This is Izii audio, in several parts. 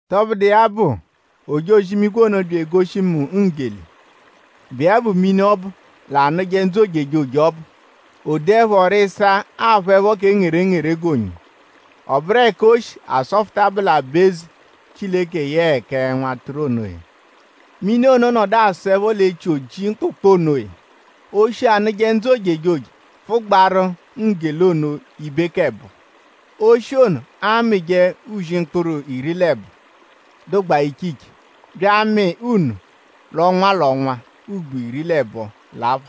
Tọbudu iya bụ; ojozi-imigwe ono bya egoshi mu nggele, bụ iya bụ mini ọbu, l'anụje ndzụ ojejoje ọbu. O doẹpho rịsaa aphụepho kẹ ngerengere g'onyo. Ọ bụru ẹka o shi asọfuta bụ l'aba-eze Chileke yẹe kẹ Nwatụru onoya. Mini ono nọdu asọepho l'echi oji mkpụkpu onoya. Oshi, anụje ndzụ ojejoje pfụgbaaru nggele ono ibe k'ẹbo ẹbo. Oshi ono amịje uzi akpụru iri l'ẹbo, dụgbaa iche iche bya amị nno l'ọnwa l'ọnwa ugbo iri l'ẹbo l'apha.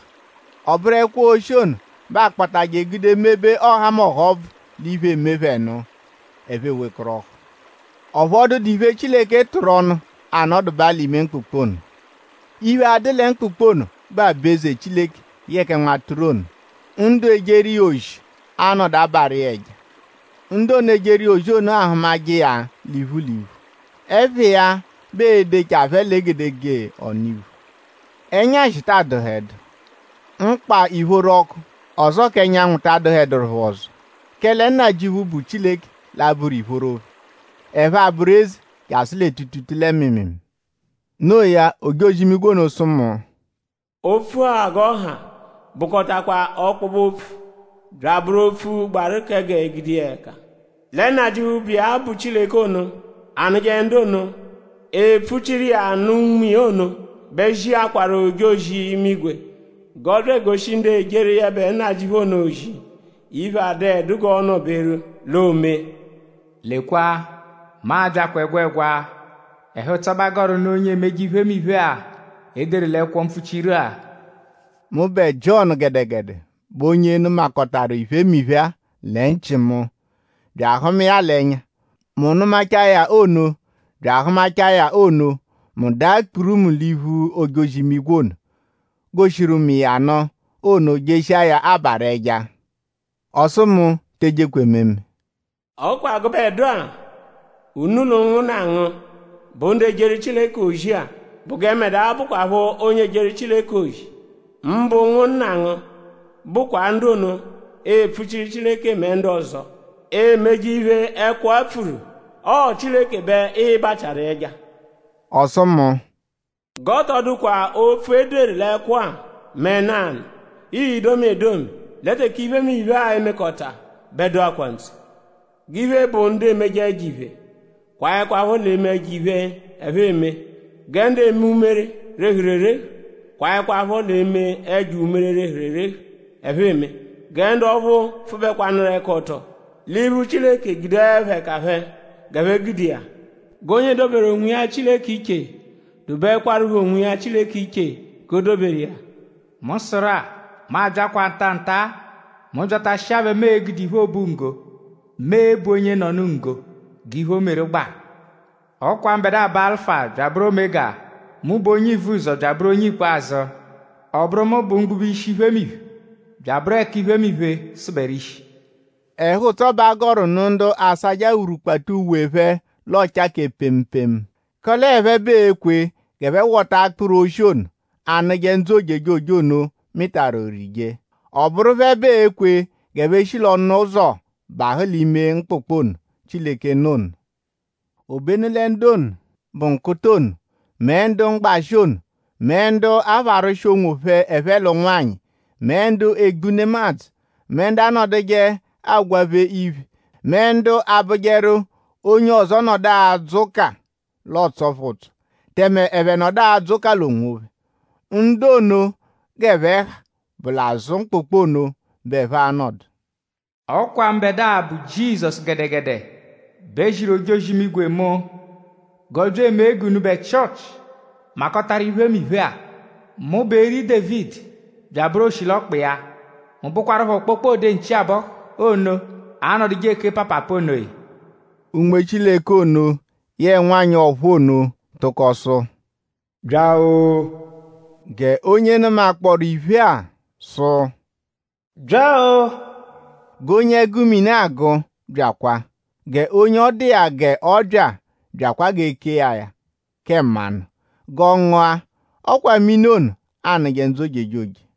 Ọ bụru ẹkwo oshi ono bẹ aakpatajẹ gude mebe ọhamoha ọbvu l'iphe, eme phẹ nụ; ẹphe ewekọrohu. Ọphu ọ dụdu iphe, Chileke tụru ọnu anọdubaa l'ime mkpụkpu ono. Iphe, a-dụ lẹ mkpụkpu ono bụ aba-eze Chileke yẹe kẹ Nwatụru ono. Ndu ejeru iya ozi a-nọdu abarụ iya ẹja. Ndu ono, ejeru iya ozi ono a-hụmaje iya l'iphu l'iphu. Ẹpha iya bẹ ee-dechaa phẹ l'egedegee ọnu-iphu. Ẹnyashi ta adụhedu. Mkpa ìphóró orọku; ọzoo k'ẹnyanwu ta adụeduru phẹ ọzo; kẹle Nnajịuphu, bụ Chileke l'a-bụru ìphóró phẹ. Ẹphe abụru eze jasụ lẹ tuutuutuu lẹ mịimiimii. Noo ya; ojozi-imigwe ono sụ mu: “Opfu-a g'ọ ha bụkotakwa ọkpobe-opfu bya abụru opfu, gbaru kẹ g'e gude iya ẹka. Lẹ Nnajịuphu, bụ iya bụ Chileke ono anụje ndu ono, epfuchiru iya nụ Unme iya ono bẹ ziakwaru ojozi-imigwe g'ọ bya egoshi ndu ejeru yẹbe Nnajịuphu ono ozi iphe, adụedu g'ọo-nọ-beru l'oomee.” “Lekwa; mu abyakwaa ẹgwegwa! Ẹhu-ụtso bẹ a gọru nụ onye emeje iphemiphe-a, e deru l'ẹkwo mpfuchiru-a.” Mụbe Jiọnu gẹdegede bụ onye nụmakotaru iphemiphe-a lẹ nchị mu; bya ahụma iya l'ẹnya. Mu nụmachaa ya ono bya ahụmachaa ya ono; mu daa kpurumu l'iphu ojozi-imigwe ono, goshiru mu iya nụ ono jeshiaru iya abarụ ẹja. Ọ sụ mu: Te ejekwa ememe! “Ọ kwa gẹ gụbedua unu l'ụnwunna ngu bụ ndu ejeru Chileke ozi-a bụ gẹ mbẹdua bụkwapho onye ejeru Chileke ozi; mbụ ụnwunna ngu bụkwa ndu ono, epfuchiru Chileke mẹ ndu ọzo, emeje iphe, ẹkwo-a pfuru. Ọo Chileke bẹ ịi-bachiaru ẹja.” Ọ sụ mu: “G'ọ tọ dụkwa opfu, e deru l'ẹkwo-a mẹ nanụ, ii-domi edomi. Lẹ teke iphemiphe-a e-mekọta bẹ dụkwaa ntse. G'iphe, bụ ndu emeje ẹjo-iphe kwaẹkwapho l'eme ẹjo-iphe, ẹphe eme. Gẹ ndu eme umere, rehuru erehu kwaẹkwapho l'eme ẹjo umere, rehuru erehu, ẹphe eme. Gẹ ndu ọphu pfụbekwanuru-ẹka-ọto l'iphu Chileke gudeẹpho ẹka phẹ g'ẹphe gude iya. G'onye doberu onwiya Chileke iche dobeẹkwarupho onwiya Chileke iche g'o doberu iya. “Mu sụru-a; mu abyaakwaa nta-a nta-a! Mu -byatashia bẹ mu e-gude iphe obunggo, mu e-bu onyenọnu nggo g'iphe, o meru gbaru. Ọ kwa mbẹdua bụ Alụfa bya abụru Omega. Mu bụ onye Ivuzọ bya abụru onye Ikpazụ. Ọ bụru mu bụ mgbube ishi iphemiphe; bya abụru mu bụ ẹka iphemiphe sụberu ishi.” Ẹhu-ụtso, bẹ a gọru nụ ndu asajẹ awurukpata uwe phẹ l'ọocha kẹ pemu pemu; kẹle ọo phẹ bẹ ee-kwe g'ẹphe wọtaje akpụru, oshi ono, anụje ndzụ ojejoje ono mịtaru; rije. Ọ bụru phẹ bẹ ee-kwe g'ẹphe shi l'ọnu-ụzo bahụ l'ime mkpụkpu ono, Chileke nọ ono. Obenu lẹ ndu ono, bụ nkụta ono; mẹ ndu mgbashị ono; mẹ ndu apharwụshi onwophẹ ẹphe l'ụnwanyi; mẹ ndu egbu nemadzụ; mẹ ndu anọduje agwaphe iphe; mẹ ndu abụjeru; onye ọzo -nọdu adzụ ụka l'ọotso phẹ ụtso; tẹme ẹphe nọdu adzụ ụka l'onwophẹ; ndu ono g'ẹphe ha bụ l'azụ mkpụkpu ono bẹ ẹphe a-nọdu. “Ọ kwa mbẹdua, bụ Jizọsu gẹdegede bẹ ziru ojozi-imigwe mu g'ọ bya emee g'unubẹ Chịochi makọtaru iphemiphe-a. Mu bụ eri Dévidi bya abụru oshilọkpa iya. Mu bụkwarupho kpokpode nchi-abọhu ono, anọduje eke paapaapa onoya.” Unme Chileke ono yẹe nwanyị ọ̀phúú ono tụko sụ: “Bya-o!” G'onye nụmakpooru iphe-a sụ: “Bya-o!” G'onye ẹgu mini agụ byakwa! G'onye ọ dụ iya g'ọ bya byakwa g'e kee ya ya kẹ mmanụ g'ọ ngụa. Ọ kwa mini ono anụje ndzụ ojejoje.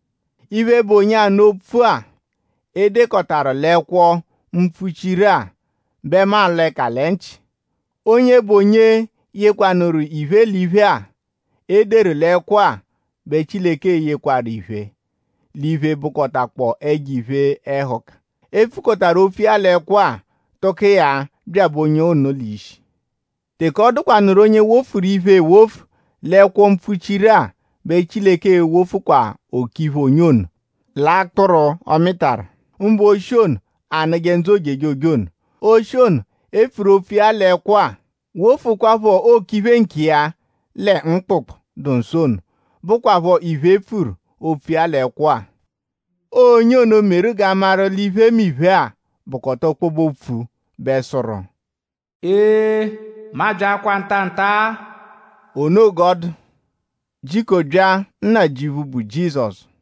Iphe, bụ onye anụ opfu-a, e dekọtaru l'ẹkwo-mpfuchiru-a; bẹ mu alọ ẹka lẹ nchị. Onye bụ onye yekwarụ iphe, l'iphe-a, e deru l'ẹkwo-a bẹ Chileke e-yekwakwa iphe, l'iphe, bụkotakpoo ẹjo iphe-ẹhuka, e pfukọtaru opfu iya l'ẹkwo-a; tụko iya byabẹ onye ono l'ishi. Teke ọ dụkwanuru onye wofuru iphe ewofu l'ẹkwo mpfuchiru-a bẹ Chileke e-wofukwa okiphe onye ono l'akpụru, ọ mịtaru; mbụ oshi ono, anụje ndzụ ojejoje ono; oshi ono, e pfuru opfu iya l'ẹkwo-a; wofukwaphọ okiphe nkiya lẹ mkpụkpu, dụ nsọ ono, bụkwapho iphe, e pfuru opfu iya l'ẹkwo-a. Ọo onye ono, meru g'a maru l'iphemiphe-a bụkota ọkpobe-opfu bẹ sụru: “Ee; mu abyaakwaa nta-a nta-a.” O noo g'ọ dụ. “Jiko bya; Nnajịuphu, bụ Jizọsu!”